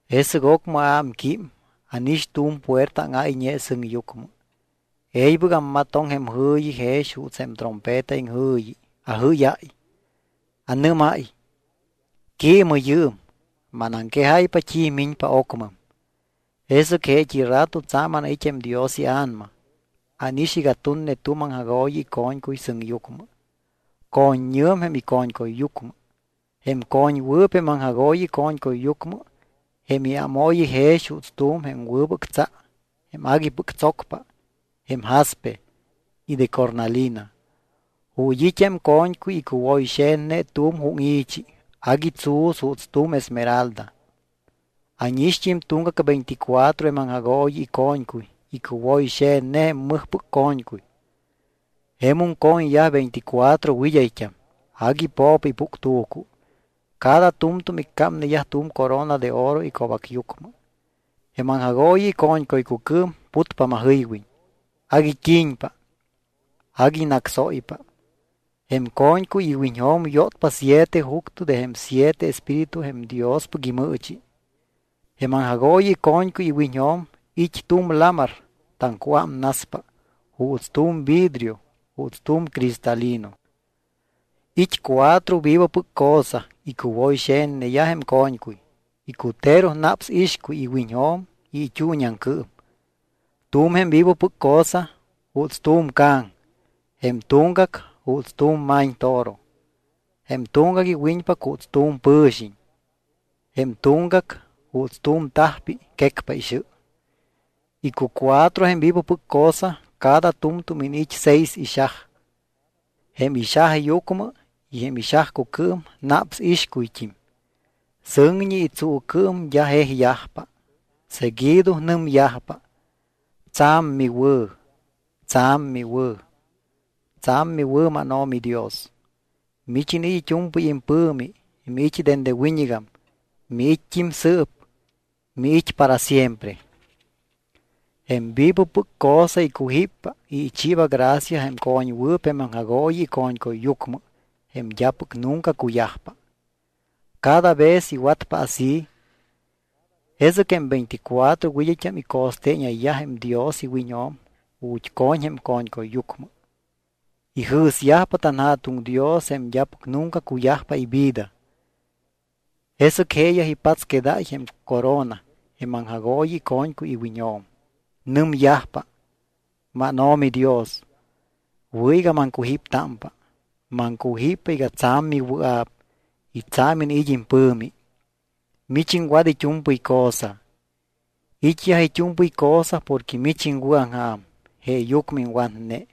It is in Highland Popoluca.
Jesɨc ocmɨ aámquím, ánix tu̱m puerta áŋáyñe sɨŋyucmɨ. E̱ybɨc ammatoŋ jém jɨ̱yi jex juuts jém trompeta iŋjɨ̱yi. Ajɨ́yáy. Anɨ́máy: —Quiimɨ yɨɨm. Manaŋquejáypa t́i miñpa ocmɨm. Jesɨc jeet́i rato tsa̱m anait́ jém Dios iA̱nama. Ánix iga tunne tu̱m aŋjagooyi ico̱ñcuy sɨŋyucmɨ. Co̱ññɨ̱m jém ico̱ñcuyyucmɨ. Jém co̱ñwɨɨp jém aŋjagooyi ico̱ñcuyyucmɨ jém iámooyi jex juuts tu̱m jém wɨbɨc tsa jém aguipɨc tsocpa jém jaspe y de cornalina. Ju̱t́ it́ jém co̱ñcuy icuwoyxe̱tne tu̱m júŋi̱chi agui tsu̱s juuts tu̱m esmeralda. Ánixt́im tuŋgac veinticuatro jém aŋjagooyi ico̱ñcuy icuwoyxe̱tne jém mɨjpɨc co̱ñcuy. Jemum co̱ñyaj veinticuatro wɨd́ayt́am. Agui po̱po ipuctu̱cu. Cada tu̱mtu̱m iccámneyaj tu̱m corona de oro ico̱bacyucmɨ. Jém aŋjagooyi ico̱ñcuycucɨɨm putpa majɨywiñ. Agui t́i̱ñpa, agui nácsóypa. Jém co̱ñcuy iwiñjo̱m yótpa siete juctɨ de jém siete espíritu jém Diospɨc imɨɨchi. Jém aŋjagooyi ico̱ñcuy iwiñjo̱m it́ tu̱m lamar taŋcuámnaspa juuts tu̱m vidrio juuts tu̱m cristalino. It́ cuatro vivopɨc cosa icuwoyxe̱tneyaj jém co̱ñcuy. Icutero naps ixcuy iwiñjo̱m y it́uuñiaŋcɨɨm. Tu̱m jém vivopɨc cosa juuts tu̱m ca̱ŋ. Jém tuŋgac juuts tu̱m ma̱ñtoro. Jém tuŋgac iwiñpac juuts tu̱m pɨ̱xiñ. Jém tuŋgac juuts tu̱m tajpi quecpa ixɨ. Icucuatro jém vivopɨc cosa cada tu̱mtu̱m iniit́ seis ixaj. Jém ixajyucmɨ y jém ixajcucɨɨm naps ixcuyt́im. Sɨŋñi y tsuucɨɨm d́a jejyajpa. Seguido nɨmyajpa: Tsa̱m miwɨ̱, tsa̱m miwɨ̱, tsa̱m miwɨ̱, mánO̱mi Dios, mich iniit́ it́u̱mpɨy impɨ̱mi. Miit́ dende wiñɨgam, miit́t́im sɨɨp, miit́ para siempre. Jém vivopɨc cosa icujíppa y ichiiba gracia jém co̱ñwɨɨp jém aŋjagooyi ico̱ñcuyyucmɨ jém d́apɨc nunca cuyajpa. Cada vez iwatpa así jesɨc jém veinticuatro wɨd́ayt́am ico̱steeñayyaj jém Dios iwiñjo̱m ju̱t́ co̱ñ jém co̱ñcuyyucmɨ. Ijɨ̱syajpa tanJa̱tuŋ Dios jém d́apɨc nunca cuyajpa ivida. Jesɨc jeeyaj ipatsquedáy jém corona jém aŋjagooyi ico̱ñcuy iwiñjo̱m. Nɨmyajpa: MánO̱mi Dios, wɨ̱ iga maŋcujíptámpa. Maŋcujíppa iga tsa̱m miwɨa̱p y tsa̱m iniit́ impɨ̱mi. Mich iŋwat it́u̱mpɨy cosa. It́yaj it́u̱mpɨy cosa porque mich iŋwɨ̱aŋja̱m. Jeeyucmɨ iŋwatne.